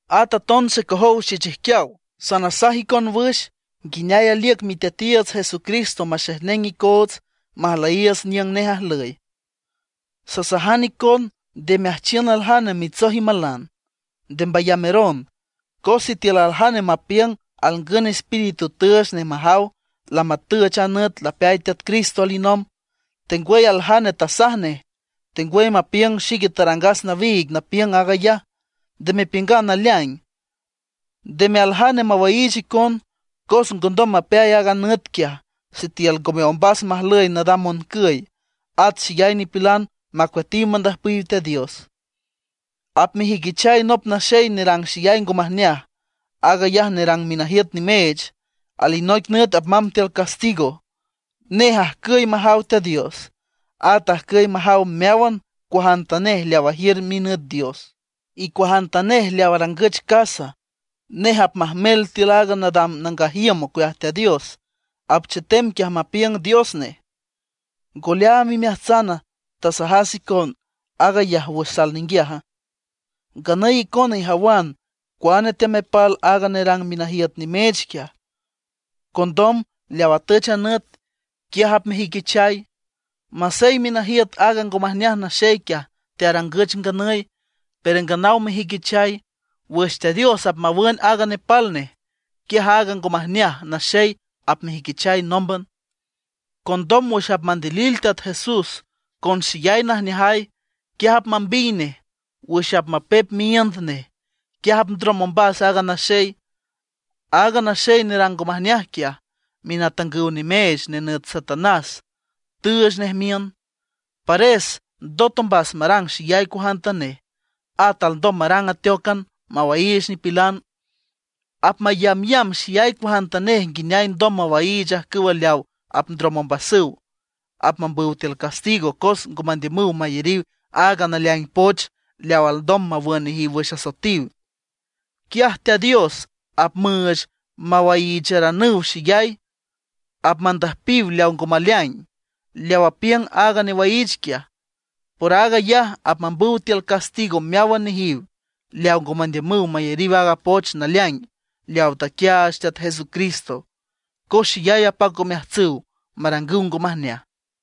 At aton xecojow xechijquiaw, sanasaj icon wüx nguineay aliüc Miteatiiüts Jesucristo maxejneng icoots majlüyiiüts niüng nej ajlüy. Sasajan icon nde meajchiün aljane mitsoj imalan, nde mbayameron. Cos sitiül aljane mapiüng alngün espíritu tüüch nej majaw lamatüch a nüt lapeay Teat Cristo alinomb, tengwüy aljane tasaj nej, tengwüy mapiüng xique tarangas nawiig napiüng aag ayaj, nde mepiüngan naleaing. Ndeme aljane mawaiich icon, cos ngondom mapeay aaga nüt quiaj sitiül ngome ombas majlüy nadam moncüy, at xeyay nipilan apmacueatiw mandüjpiw Teat Dios. Apmejüiquichay nop naxey nerang xeyay ngo majneaj; aag ayaj nerang minajiüt nimeech; alinoic nüt apmamb tiül castigo. Nej ajcüy majaw Teat Dios, at ajcüy majaw meáwan cuajantanej leaw ajiür minüt dios, y cuajantanej leaw arangüch casa. Nej apmajmel tiül aaga nadam nangaj iüm ocueaj Teat Dios, apchetem quiaj mapiüng dios nej. ¿Ngo leaam imeajtsana, tasajas icon aag ayaj wüx sal ninguiaja? Nganüy icona ijawan cuane teamepal aaga nerang minajiüt nimeech quiaj; condom leaw atüch a nüt, quiaj apmejüiquichay. Masey minajiüt aaga ngo majneaj naxey quiaj tearangüch nganüy, pero nganaw mejüiquichay. Wüx Teat Dios apmawün aaga nepal nej, quiaj aaga ngo majneaj naxey apmejüiquichay nómban. Condom wüx apmandilil Teat Jesús con xeyay najneajay, quiaj apmambiy nej wüx apmapep miíünd nej, quiaj apndrom ombas aaga naxey. Aaga naxey nerang ngo majneaj quiaj, minatangüw nimeech nenüt Satanás tüüch nej miün. Pares ndot ombas marang xeyay cuajantanej, at alndom marang ateócan mawaiich nipilan. Apmayambyamb xeyay cuajantanej nguineay alndom mawaiich ajcüwa leaw apndrom ombasüw, apmambüw tiül castigo cos ngo mandiümüw mayariw aaga naleaing poch leaw alndom mawün nejiw wüx asoetiw nejiw. Quiaj Teat Dios apmüüch mawaiicharanüw xeyay, apmandüjpiw leaw ngo maleaing, leaw apiüng aaga newaiich quiaj. Por aag ayaj apmambüw tiül castigo meáwan nejiw leawa ngo mandiümüw mayariw aaga poch naleaing leawa taquiaach Teat Jesucristo, cos xeyay apac omeajtsüw marangüw ngo majneaj.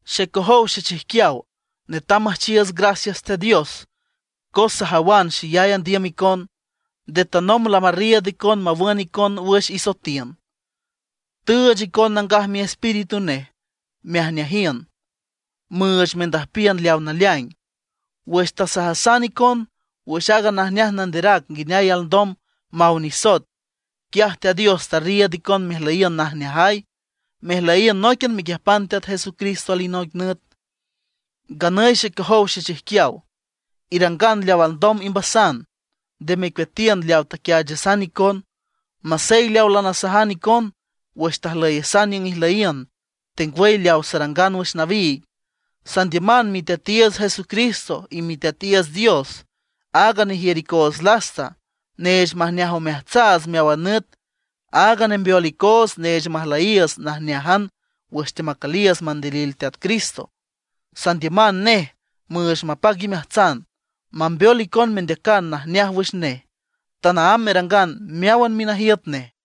Xecojow xechijquiaw, netam müjchiiüts gracias Teat Dios cos sajawan xeyay andiüm icon. Nde tanomb lamarriiüd icon mawün icon wüx isoetiün; tüüch icon Nangaj Miespíritu nej mejneajiün, müüch mendüjpiün leawa naleaing. Wüx tasajasan icon wüx aaga najneaj nanderac nguineay alndom maw nisoet, quiaj Teat Dios tarriiüd icon mejlüyiün najneajay, mejlüyiün nóiquian mequiüjpan Teat Jesucristo alinoic nüt. Nganüy xecojow xechijquiaw, irangan leaw alndom imbasan, nde mecueatiün leaw taquiaachasan icon, masey leaw lanasajan icon wüx tajlüyasan niüng ijlüyiün, tengwüy leaw sarangan wüx nawiig. Sandiüman Miteatiiüts Jesucristo y Miteatiiüts Dios, áag nejiür icoots lasta, neech majneaj omeajtsaats meáwan nüt, áag nembeol icoots neech majlüyiiüts najneájan wüx teamacüliiüts mandilil Teat Cristo. Sandiüman nej müüch mapac imeajtsan, mambeol icon mendeacan najneaj wüx nej, tanaámb merangan meáwan minajiüt nej.